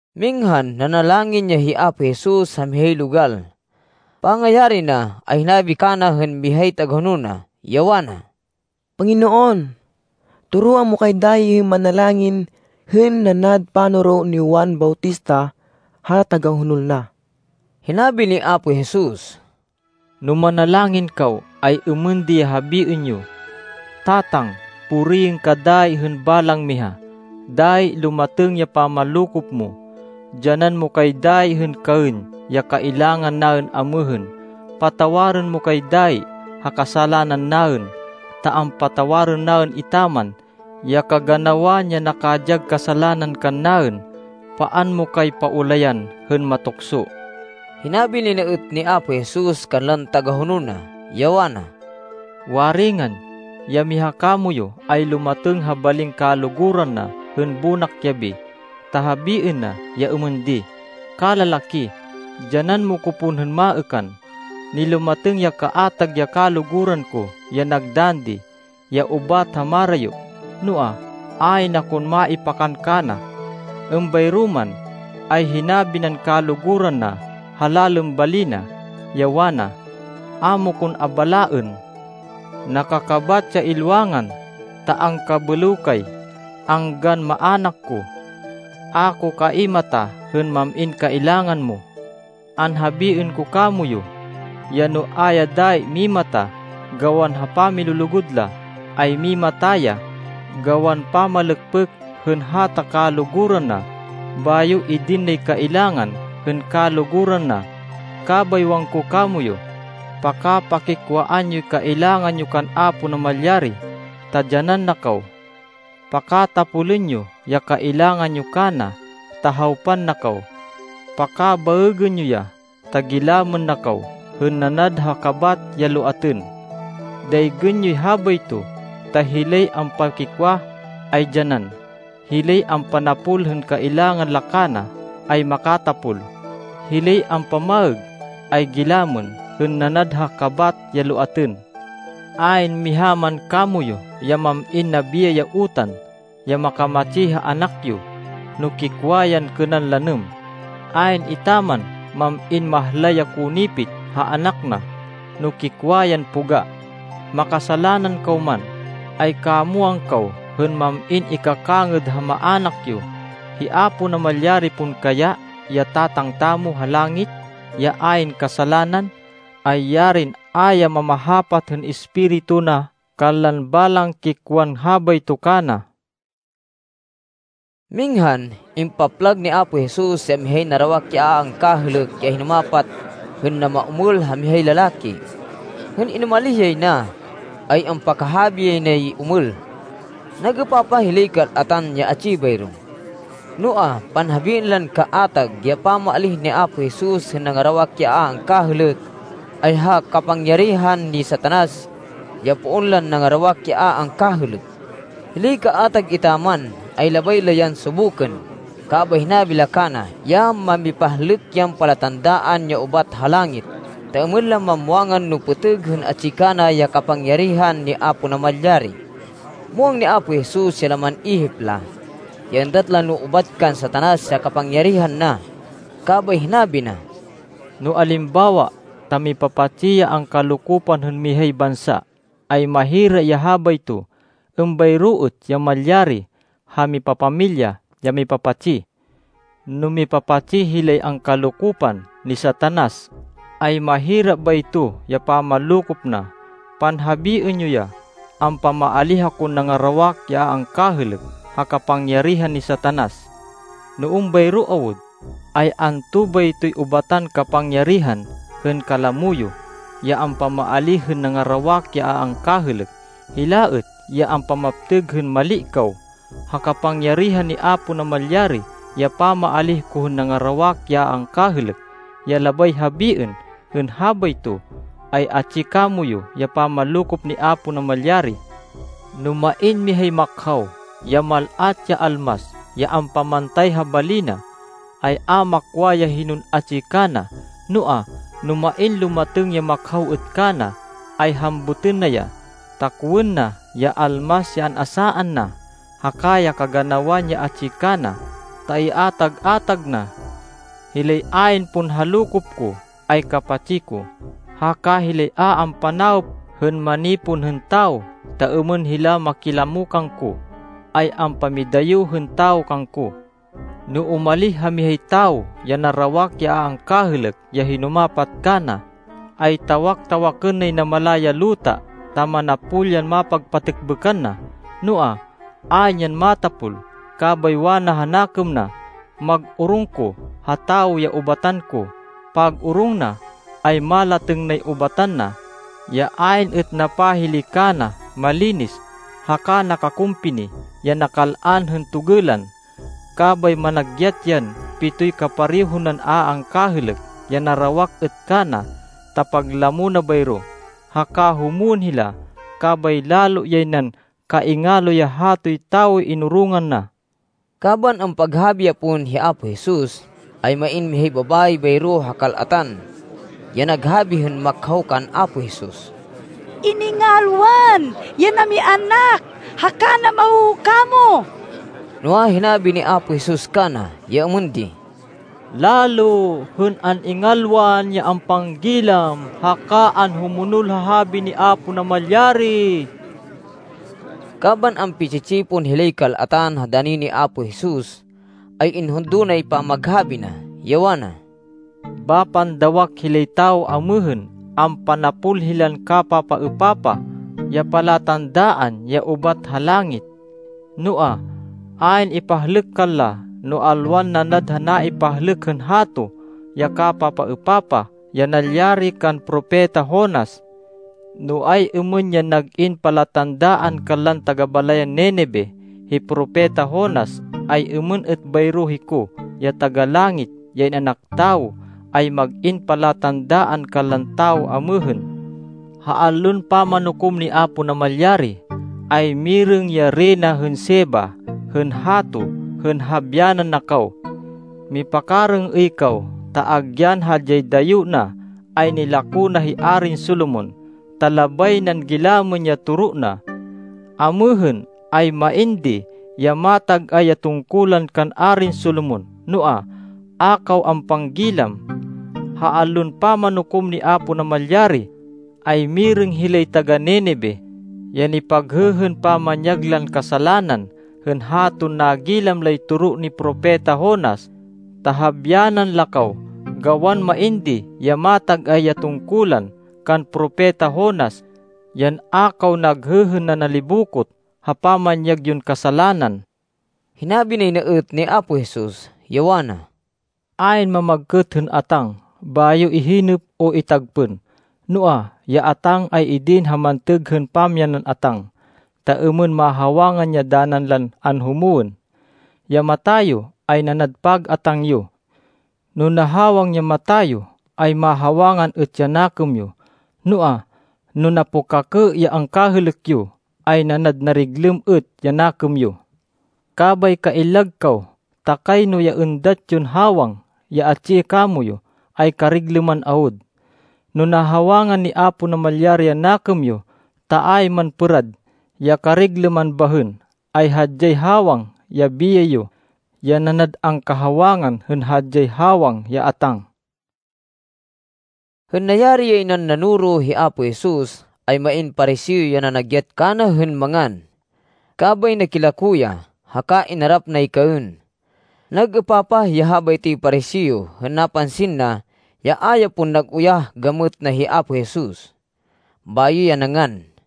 Minghan nanalangin ya hi Apo Jesus ha mihay logal. Pangayari na, ay hinabi kana hên mihay tagahonol na, ya wana, “Panginoon, toroan mo kay dayi hên manalangin hên nanad panoro ni Juan Bautista ha tagahonol na.” Hinabi ni Apo Jesus, “No manalangin kaw, ay êmên di ya habiên yo: ‘Tatang, puriên ka dayi hên balang miha. Dayi lumatêng ya pamanlokop mo. Dyanan mo kay dayi hên kaên ya kailangan naên amêhên. Patawarên mo kay dayi ha kasalanan naên ta ampatawarên naên etaman ya kaganawan ya nakadyag kasalanan kannaên. Paan mo kay paulayan hên matukso.’” Hinabi nay na êt ni Apo Jesus kanlan tagahonol na, ya wana, “Waringan, ya miha kamoyu ay lumatêng ha balin kaluguran na hên bonak yabi, ta habiên na ya êmên di, ‘Kalalaki, dyanan mo ko pon hên maêkan. Nilumatêng ya kaatag ya kaluguran ko ya nagdann di, ya ubat ha marayo, noa, ayn akon maipakan kana.’ Êmbayro man, ay hinabi nan kaluguran na ha lalên bali na, ya wana, ‘A mo kon abalaên. Nakakabat ya ilwangan, ta angkabêlêw kay, anggan maának ko. A ko kaimata hên mam-in kailangan mo.’ “Anhabiên ko kamoyu ya no a ya dayi mimata gawan ha pamilulugud la, ay mimata ya gawan pamalêkpêk hên hata kaluguran na, bayo idin nay kailangan hên kaluguran na. Kabay wangko kamoyu, pakapakikwaan yoy kailangan yo kan Apo Namalyari, ta dyanan na kaw. Pakatapolên yo ya kailangan yo kana, ta hawpan na kaw. Pakabaêgên yo ya, ta gilamên na kaw hên nanad ha kabat ya loatên. Daygên yoy habayto, ta hilay ampakikwa ay dyanan. Hilay ampanapol hên kailangan la kana ay makatapol. Hilay ampamaêg ay gilamên hên nanad ha kabat ya loatên. Ayn miha man kamoyu ya mam-in nabiyay ya utan ya makamatsi ha anak yo, no kikwa yan kênan lanêm. Ayn etaman mam-in mahlay ya konipit ha anak na, no kikwa yan poga. Makasalanan kaw man, ay kamwang kaw hên mam-in ikakangêd ha maának yo. Hi Apo Namalyari pon kaya, ya Tatang tamo ha langit, ya ayn kasalanan, ay yarin a ya mamahapat hên Espiritu na kanlan balang kikwan habayto kana!” Minghan impaplag ni Apo Jesus ya mihay narawak ya a angkahêlêk ya hinumapat, hên namaomêl ha mihay lalaki. Hên inumalih yay na, ay ampakahabi yay nay omêl. Nag-êpapah hilay kal-atan ya atsi bayro. Noa, panhabiên lan kaatag, ya pamaalíh ni Apo Jesus hên nangarawak ya a angkahêlêk, ay ha kapangyarihan ni Satanas, ya poon lan nangarawak ya a angkahêlêk. Hilay kaatag etaman, ay labay la yan subukên, kabay hinabi la kana ya mamipahlêk yan palatandaan, ya ubat ha langit, ta êmên la mamwangan no pêtêg hên atsi kana ya kapangyarihan ni Apo Namalyari. Muwang ni Apo Jesus ya laman ihip la, ya êndat la no ubat kan Satanas ya kapangyarihan na. Kabay hinabi na, “No alimbawa ta mipapatsi ya angkalokopan hên mihay bansa, ay mahira ya habayto. Êmbayro êt ya malyari ha mipapamilya ya mipapatsi. No mipapatsi hilay angkalokopan ni Satanas, ay mahira bayto ya pamanlokop na. Panhabiên yo ya ampamaalíh akon nangarawak ya a angkahêlêk ha kapangyarihan ni Satanas. No êmbayro awud, ay anto baytoy ubatan kapangyarihan hên kalamo yo, ya ampamaalíh hên nangarawak ya a angkahêlêk? Hila êt ya ampamaptêg hên mali kaw. Ha kapangyarihan ni Apo Namalyari ya pamaalíh ko hên nangarawak ya a angkahêlêk. Ya labay habiên hên habayto, ay atsi kamoyu ya pamanlokop ni Apo Namalyari. “No main mihay makhaw, ya mal-at ya almas, ya ampamantay ha bali na, ay a makwa ya hinon atsi kana. Noa, no main lumatêng ya makhaw êt kana, ay hambutên na ya, ta kowên na ya almas ya an-asaan na, haka ya kaganawan ya atsi kana, ta iatag-atag na. “Hilay ayn pon ha lokop ko, ay kapatsi ko. Haka hilay a ampanawop hên manipon hên tawo ta êmên hila makilamo kangko, ay ampamidayo hên tawo kangko. “No umalih ha mihay tawo ya narawak ya a angkahêlêk, ya hinumapat kana, ay tawak-tawakên nay namala ya luta, ta manapol yan mapagpatêkbêkan na. Noa, ayn yan matapol. Kabay wana ha nakêm na, ‘Mag-orong ko ha tawo ya ubatan ko.’ Pag-orong na, ay malatêng nay ubatan na, ya ayn êt napahili kana, malinis, haka nakakumpini, ya nakal-an hên togêlan. Kabay managyat yan pitoy kapareho nan a angkahêlêk, ya narawak êt kana, ta paglamo na bayro. Haka humwên hila, kabay lalo yay nan kaingalo ya hatoy tawoy inorongan na.” Kaban ampaghabi ya pon hi Apo Jesus, ay main mihay babayi bayro ha kal-atan, ya naghabi hên makhaw kan Apo Jesus, “Iningalwan ya namianak haka namahoho kamo.” Noa, hinabi ni Apo Jesus kana ya êmên di, “Lalo hên an-ingalwan ya ampanggilam haka anhumonol ha habi ni Apo Namalyari.” Kaban ampi-tsi-tsipon hilay kal-atan ha dani ni Apo Jesus, ay inhundo nay pamaghabi na, ya wana, “Bapan dawak hilay tawo amêhên. Ampanapol hilan kapapaêpapah ya palatandaan ya ubat ha langit. Noa, ayn ipahlêk kanla, no alwan nanad ha naipahlêk hên hato, ya kapapaêpapah ya nalyari kan Propeta Jonas. No ay-êmên yan nag-in palatandaan kanlan taga-balayan Ninive, hi Propeta Jonas, ay êmên êt bayro hiko, ya Taga-Langit, ya In-anak Tawo, ay mag-in palatandaan kanlan tawo amêhên. Ha Allon Pamanukom ni Apo Namalyari, ay mirêng ya Reyna hên Sheba hên hato hên habyanan na kaw. Mipakarêng-êy kaw, ta agyan hadyay dayo na, ay nilako na hi Arin Solomon, ta labay nan gilamên ya toro na. Amêhên, ay main di ya matag-ay ya tungkulan kan Arin Solomon, noa, a kaw ampanggilam. Ha Allon Pamanukom ni Apo Namalyari, ay mirêng hilay taga-Ninive, ya nipaghêhên pamanyag lan kasalanan, hên haton nagilam lay toro ni Propeta Jonas, ta habyanan la kaw, gawan main di ya matag-ay ya tungkulan kan Propeta Jonas, yan a kaw naghêhên nanalibokot ha pamanyag yon kasalanan.” Hinabi nay na êt ni Apo Jesus, ya wana, “Ayn mamagkêt hên atáng, bayo ihinêp o itagpên. Noa, ya atáng ay idin ha mantêg hên pamyanan atáng, ta êmên mahawangan ya danan lan anhumwên. Ya mata yo ay nanad pag-atáng yo. No nahawang ya mata yo, ay mahawangan êt ya nakêm yo. Noa, no napukakê ya angkahêlêk yo, ay nanad nariglêm êt ya nakêm yo. Kabay kaillag kaw, ta kayno ya êndat yon hawang, ya atsi kamoyu, ay kariglêman awud. No nahawangan ni Apo Namalyari ya nakêm yo, ta ayn man pêrad ya kariglêman bahên, ay hadyay hawang ya biyay yo, ya nanad angkahawangan hên hadyay hawang ya atáng.” Hên nayari yay nan nanoro hi Apo Jesus, ay main Pariseo ya nanagyat kana hên mangan. Kabay nakilako ya, haka inarap nay kaên. Nag-êpapah ya habaytoy Pariseo hên napansin na, ya a ya pon nag-uyah gamêt na hi Apo Jesus, bayo ya nangan.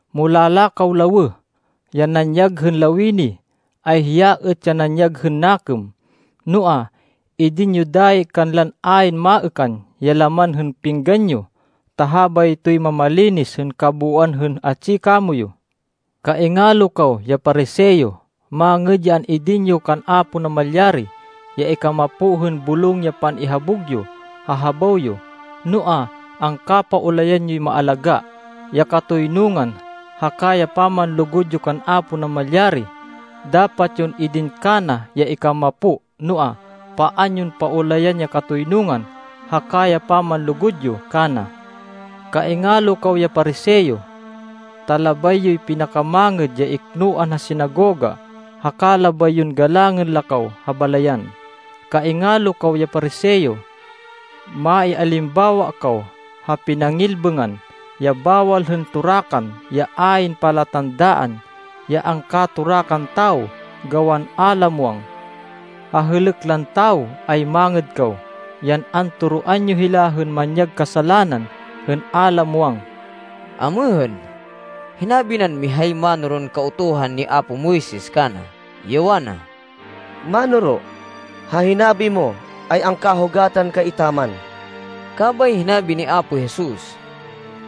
Mulala kaw lawêh! Ya nanyag hên lawini, ay hiya êt ya nanyag hên nakêm. Noa, idin yo dayi kanlan ayn maêkan ya laman hên pinggan yo, ta habaytoy mamalinis hên kabooan hên atsi kamoyu. “Kaingalo kaw ya Pariseo! Mangêd ya an-idin yo kan Apo Namalyari ya ikamapo hên bulong ya pan-ihabug yo ha habaw yo, noa, angkapaulayan yoy maalagá, ya katoynungan haka ya pamanlugud yo kan Apo Namalyari. Dapat yon idin kana ya ikamapo, noa, paan yon paulayan ya katoynungan haka ya pamanlugud yo kana. “Kaingalo kaw ya Pariseo! Ta labay yoy pinakamangêd ya iknoan ha sinagoga, haka labay yon galangên la kaw ha balayan. Kaingalo kaw ya Pariseo! Maialimbawa kaw ha pinangilbêngan ya bawal hên torakan ya ayn palatandaan, ya angkatorakan tawo gawan a la muwang. Ha hêlêk lan tawo ay mangêd kaw, yan antoroan yo hila hên manyag kasalanan hên a la muwang.” Amêhên, hinabi nan mihay mánoron Kautuhan ni apo Moises kana, ya wana, “Mánoro, ha hinabi mo, ay angkahugatan kay etaman.” Kabay hinabi ni Apo Jesus,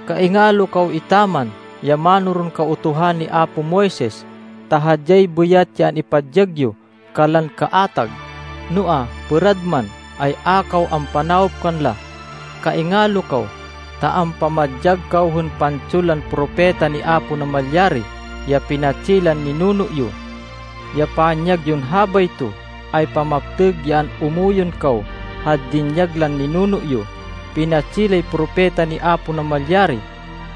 “Kaingalo kaw etaman, ya mánoron Kautuhan ni apo Moises, ta hadyay bêyat ya an-ipadyag yo kanlan kaatag, noa, pêrad man, ay a kaw ampanawop kanla. Kaingalo kaw, ta ampamadyag kaw hên pantson lan propeta ni Apo Namalyari ya pinatsi lan ninuno yo. Ya panyag yon habayto, ay pamaptêg ya an-umuyon kaw ha dinyag lan ninuno yo. Pinatsi lay propeta ni Apo Namalyari,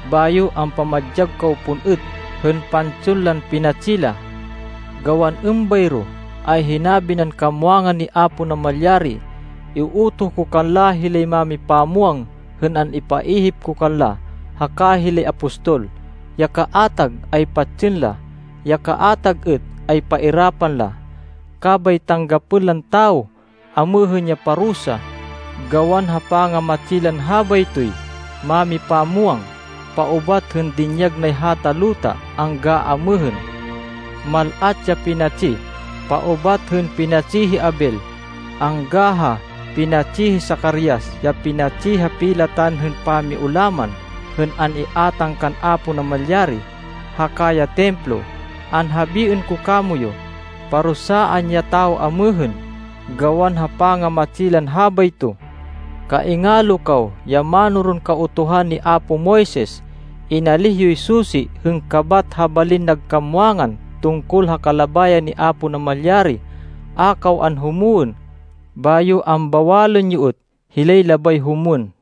bayo ampamadyag kaw pon êt hên pantson lan pinatsi la. Gawan êmbayro, ay hinabi nan kamwangan ni Apo Namalyari, ‘Iutoh ko kanla hilay mámipamwang hên an-ipaihip ko kanla haka hilay apostol. Ya kaatag ay patsên la. Ya kaatag êt ay pairapan la.’ Kabay tanggapên lan tawo amêhên ya parusa, gawan ha pangamatsi lan habaytoy mámipamwang, paubat hên dinyag nay hata luta angga amêhên. Mal-at ya pinatsi paubat hên pinatsi hi Abel, angga ha pinatsi hi Zacarias, ya pinatsi ha pilatan hên pamiulaman hên an-iátang kan Apo Namalyari haka ya Templo. Anhabiên ko kamoyu, parusaan ya tawo amêhên, gawan ha pangamatsi lan habayto. “Kaingalo kaw ya mánoron Kautuhan ni apo Moises! Inalíh yoy susi hên kabat ha balin nag kamwangan tungkol ha kalabayan ni Apo Namalyari. A kaw anhumwên, bayo ambawalên yo êt hilay labay humwên.”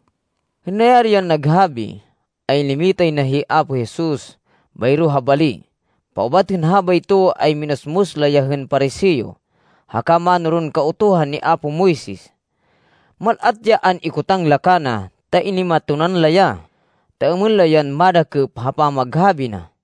Hên nayari yan naghabi, ay nimitay na hi Apo Jesus bayro ha bali. Paubat hên habayto, ay minusmus la ya hên Pariseo haka mánoron Kautuhan ni apo Moises. Mal-at ya an-ikotang la kana ta inimatonan la ya, ta êmên la yan madakêp ha pamaghabi na.